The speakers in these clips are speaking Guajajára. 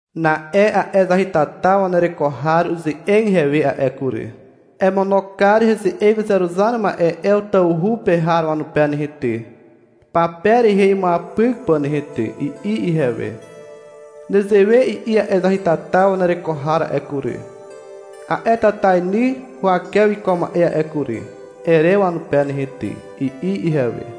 Na'e a'e zahytata wanereko har uze'eg ihewe a'e kury. — Emono kar heze'eg uzeruzar ma'e Ew tawhu pe har wanupe nehe ty, pape rehe imuapyk pà nehe ty, i'i ihewe. — Nezewe i'i a'e zahytata wanereko har a'e kury, a'e tatainy huwake wiko ma'e a'e kury, ere wanupe nehe ty, i'i ihewe.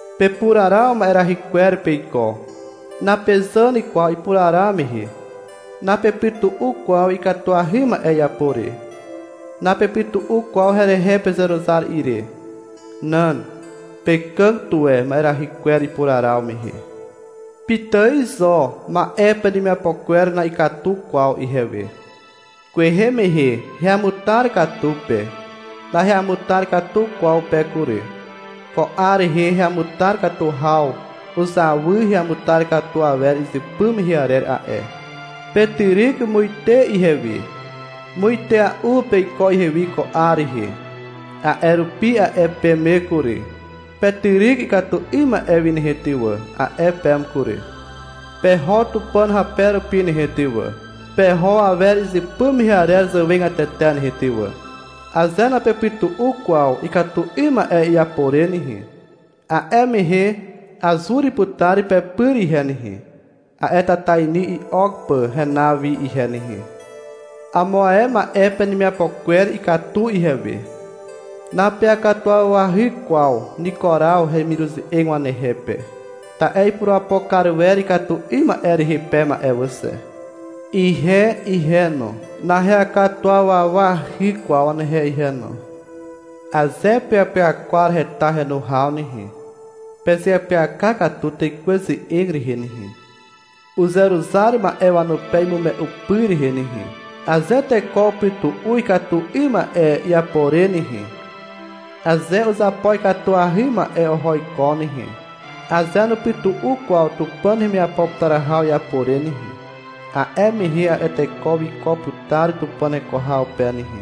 Pepuraraw ma'erahy kwer peiko. Napezàn kwaw ipuraraw mehe. Napepytu'u kwaw ikatuahy ma'e iapo re. Napepytu'u kwaw herehe pezeruzar ire. Nan. Pekàg tuwe ma'erahy kwer ipuraraw mehe. Pitài zo ma'e penemiapo kwer na'ikatu kwaw ihewe. Kwehe mehe heamutar katu pe. Naheamutar katu kwaw pe kury. Ko 'ar rehe heamutar katu haw uzawy heamutar katu awer izypy mehe arer a'e. Petyryk muite ihewi. Muitea'u peiko ihewi ko 'ar rehe. A'e rupi a'e peme kury. — Petyryk ikatu 'ym ma'e wi nehe ty wà, a'e peme kury. — Peho Tupàn hape rupi nehe ty wà, peho awer izypy mehe arer zàwegatete nehe ty wà. Aze napepytu'u kwaw ikatu 'ym ma'e iapo re nehe, a'e mehe azur putar pepyr ihe nehe, a'e tatainy i'ok pà henaw wi ihe nehe. Amo ae ma'e penemiapo kwer ikatu ihewe. Napeakatuwawahy kwaw Nikuraw hemiruze'eg wanehe pe, ta'e ipurapo kar wer ikatu 'ym ma'e rehe peme a'e wà xe. Ihe ihe no, naheakatuwawahy kwaw wanehe ihe no. Aze peapyakwar heta henu haw nehe, pezeapyaka katu Tekwe ze'eg rehe nehe, uzeruzar ma'e wanupe imume'u pyr rehe nehe. — Aze teko upytu'u ikatu 'ym ma'e iapo re nehe, aze uzapo ikatuahy ma'e oho iko nehe, aze nupytu'u kwaw Tupàn hemiapo putar haw iapo re nehe, a'e mehe a'e teko wiko putar Tupàn heko haw pe nehe,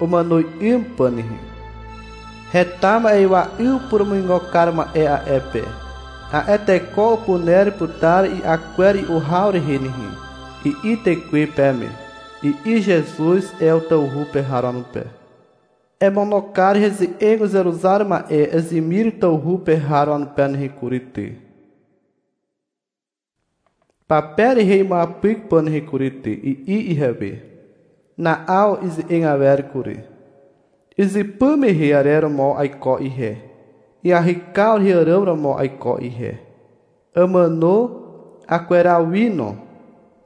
umàno 'ym pà nehe. Heta ma'ywa 'yw purumuigo kar ma'e a'e pe. A'e teko upuner putar i'a kwer i'u haw rehe nehe, i'i Tekwe peme, i'i Zezuz Ew tawhu pe har wanupe. — Emono kar heze'eg uzeruzar ma'e Ezimir tawhu pe har wanupe nehe kury ty, pape rehe imuapyk pà nehe kury ty, i'i ihewe. Na'aw ize'eg awer kury. — Izypy mehe arer romo aiko ihe, iahykaw rehe àràm romo aiko ihe. Àmàno, akweraw wi no.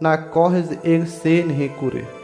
Nako heze'eg xe nehe kury.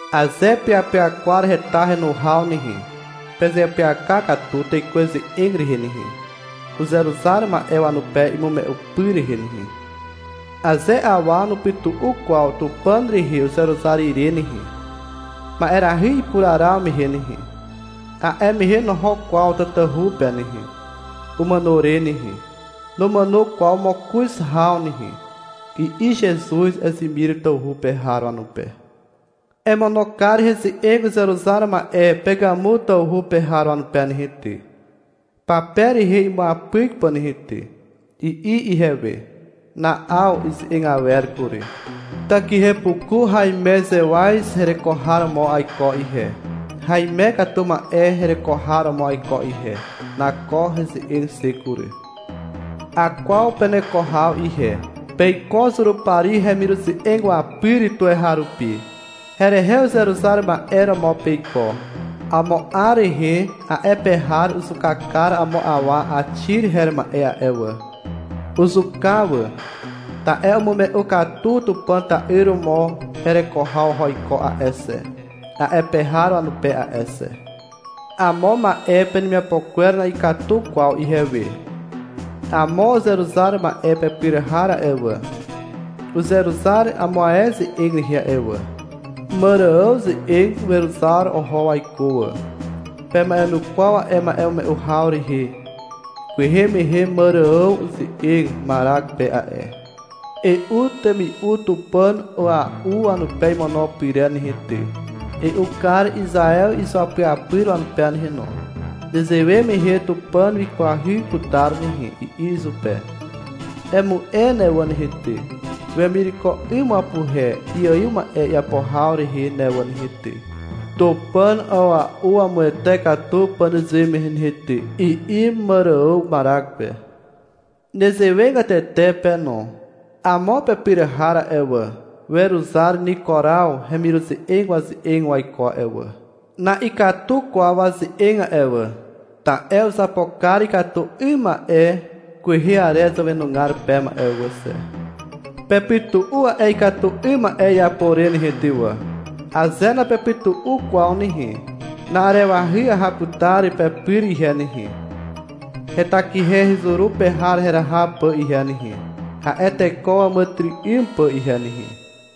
Aze peapyakwar heta henu haw nehe, pezeapyaka katu Tekwe ze'eg rehe nehe, uzeruzar ma'e wanupe imume'u pyr rehe nehe. — Aze awa nupytu'u kwaw Tupàn rehe uzeruzar ire nehe, ma'erahy ipuraraw mehe nehe, a'e mehe noho kwaw tatahu pe nehe, umàno re nehe. Numàno kwaw mokoz haw nehe, i'i Zezuz Ezimir tawhu pe har wanupe. — Emono kar heze'eg uzeruzar ma'e Pegàmu tawhu pe har wanupe nehe ty, pape rehe imuapyk pà nehe ty, i'i ihewe. Na'aw ize'eg awer kury. — Takihepuku haimezewaz hereko har romo aiko ihe, haime katu ma'e hereko har romo aiko ihe. Nako heze'eg xe kury. Akwaw peneko haw ihe. Peiko Zurupari hemiruze'eg wapyr tuweharupi. Herehe uzeruzar ma'e romo peiko. Amo 'ar rehe a'e pe har uzuka kar amo awa Àxi her ma'e a'e wà. Uzuka wà, ta'e umume'u katu Tupàn ta'yr romo hereko haw oho iko a'e xe, a'e pe har wanupe a'e xe. Amo ma'e penemiapo kwer na'ikatu kwaw ihewe. Amo uzeruzar ma'e pepyr har a'e wà, uzeruzar amo ae ze'eg rehe a'e wà. Màrààw ze'eg weruzar oho waiko wà. Pema'enukwaw a'e ma'emume'u haw rehe. Kwehe mehe Màrààw uze'eg Marak pe a'e. — E'u temi'u tupàn a'ua'u wanupe imono pyrer nehe ty, E'u kar Izaew izuapyapyr wanupe nehe no. Nezewe mehe Tupàn wikwahy putar nehe, i'i izupe. — Emu'e ne wà nehe ty, wemireko 'ym wapuhe iaiw ma'e iapo haw rehe ne wà nehe ty, tupàn a'ua'u wamuwete katu pà nezewe mehe nehe ty, i'i Màrààw Marak pe. Nezewegatete pe no. Amo pepyr har a'e wà, weruzar Nikuraw hemiruze'eg waze'eg waiko a'e wà. Na'ikatu kwaw waze'eg a'e wà, ta'e uzapo kar ikatu 'ym ma'e kwehe arer zàwenugar peme a'e wà xe. Pepytu'u a'e ikatu 'ym ma'e iapo re nehe ty wà. Aze napepytu'u kwaw nehe, na'arewahy aha putar pepyr ihe nehe, hetakihe hezuru pe har heraha pà ihe nehe, a'e teko wàmàtyry'ym pà ihe nehe.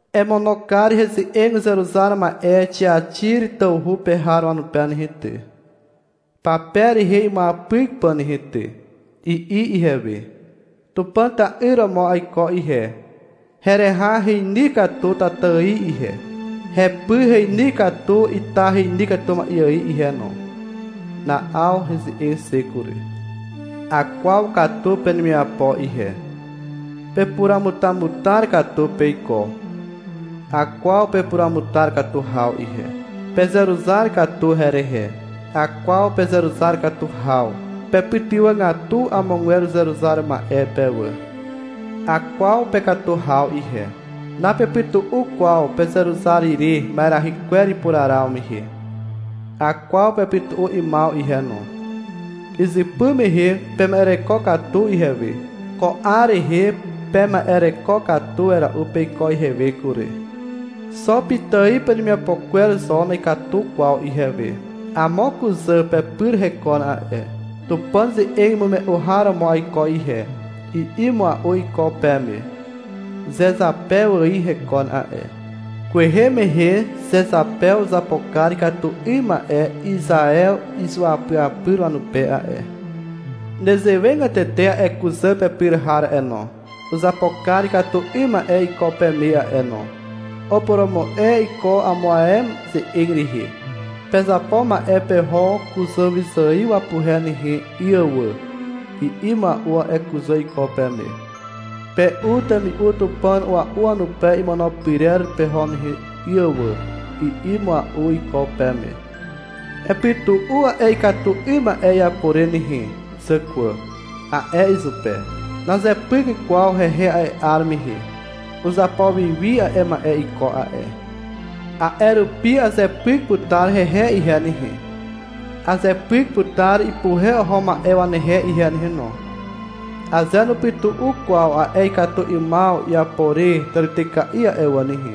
— Emono kar heze'eg uzeruzar ma'e Xiaxir tawhu pe har wanupe nehe ty, pape rehe imuapyk pà nehe ty, i'i ihewe. — Tupàn ta'yr romo aiko ihe. Hereha heny katu tata ài ihe. Hepy heny katu ita heny katu ma'e ài ihe no. Na'aw heze'eg xe kury. Akwaw katu penemiapo ihe. Pepuramutamutar katu peiko. Akwaw pepuruamutar katu haw ihe. Pezeruzar katu herehe. Akwaw pezeruzar katu haw. Pepytywàgatu amogwer uzeruzar ma'e pe wà. Akwaw pekatu haw ihe. Napepytu'u kwaw pezeruzar ire ma'erahy kwer ipuraraw mehe. Akwaw pepytu'u 'ymaw ihe no. Izypy mehe pema'ereko katu ihewe. Ko 'ar rehe pema'ereko katu wera'u peiko ihewe kury. Xo pitài penemiapo kwer zo na'ikatu kwaw ihewe. Amo kuzà pepyr hekon a'e. — Tupàn ze'eg imume'u har romo aiko ihe, i'i mua'u iko peme. Zezapew ài hekon a'e. Kwehe mehe Zezapew uzapo kar ikatu 'ym ma'e Izaew izuapyapyr wanupe a'e. Nezewegatete a'e kuzà pepyr har a'e no. Uzapo kar ikatu 'ym ma'e iko peme a'e no. Upurumu'e iko amo ae ze'eg rehe. — Pezapo ma'e peho kuzàwyzài wapuhe nehe 'y wà, i'i mua'u a'e kuzà iko peme. — Pe'u temi'u tupàn a'ua'u wanupe imono pyrer peho nehe 'y wà, i'i mua'u iko peme. — Epytu'u a'e ikatu 'ym ma'e iapo re nehe zàkwà, a'e izupe. Nazepyk kwaw hehe a'e 'ar mehe. Uzapo wi wi a'e ma'e iko a'e. A'e rupi azepyk putar hehe ihe nehe, azepyk putar ipuhe oho ma'e wanehe ihe nehe no. Aze nupytu'u kwaw a'e ikatu 'ymaw iapo re tàrityka'i a'e wà nehe,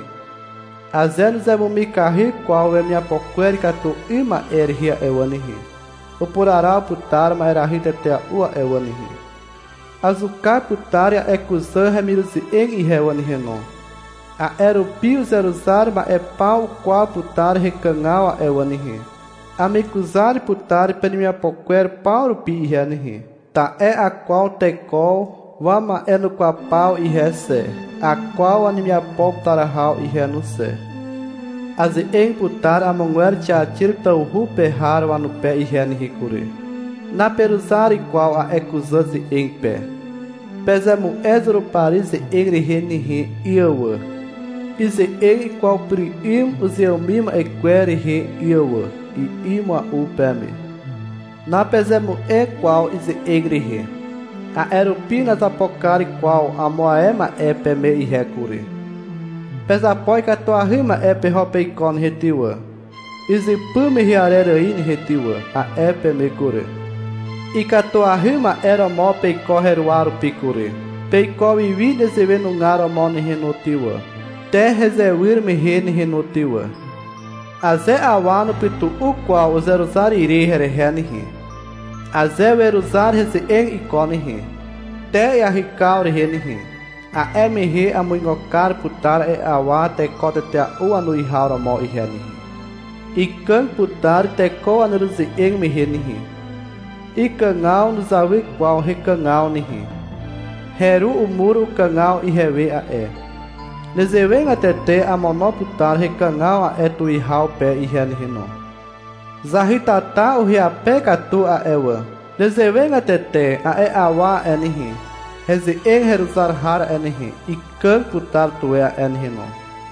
aze nuzemumikahy kwaw wemiapo kwer ikatu 'ym ma'e rehe a'e wà nehe, upuraraw putar ma'erahy tetea'u a'e wà nehe. Azuka putar a'e kuzà hemiruze'eg ihe wà nehe no. A'e rupi uzeruzar ma'e paw ukwaw putar hekàgaw a'e wà nehe. Amekuzar putar penemiapo kwer paw rupi ihe nehe. Ta'e akwaw teko wama'enukwaw paw ihe xe. Akwaw wanemiapo putar haw ihe no xe. Aze'eg putar amogwer Xiaxir tawhu pe har wanupe ihe nehe kury. Naperuzar kwaw a'e kuzà ze'eg pe. — Pezemu'e Zurupari ze'eg rehe nehe 'y wà, ize'eg ikwaw pyr 'ym uzeàmim ma'e kwer rehe 'y wà, i'i mua'u peme. Napezemu'e kwaw ize'eg rehe. A'e rupi nazapo kar kwaw amo ae ma'e peme ihe kury. — Pezapo ikatuahy ma'e peho peiko nehe ty wà, izypy mehe arer ài nehe ty wà, a'e peme kury. Ikatuahy ma'e romo peiko heruwa rupi kury. Peiko wi wi nezewe nugar romo nehe no ty wà, te hezewyr mehe nehe no ty wà. Aze awa nupytu'u kwaw uzeruzar ire herehe nehe, aze weruzar heze'eg iko nehe, te iahykaw rehe nehe, a'e mehe amuigo kar putar a'e awa teko tetea'u wanuwihaw romo ihe nehe. Ikàg putar teko waneruze'eg mehe nehe. Ikàgaw nuzawy kwaw hekàgaw nehe. Heru umur ukàgaw ihewe a'e. Nezewegatete amono putar hekàgaw a'e tuwihaw pe ihe nehe no. Zahytata uhyape katu a'e wà. Nezewegatete a'e awa a'e nehe, heze'eg heruzar har a'e nehe, ikàg putar tuwe a'e nehe no.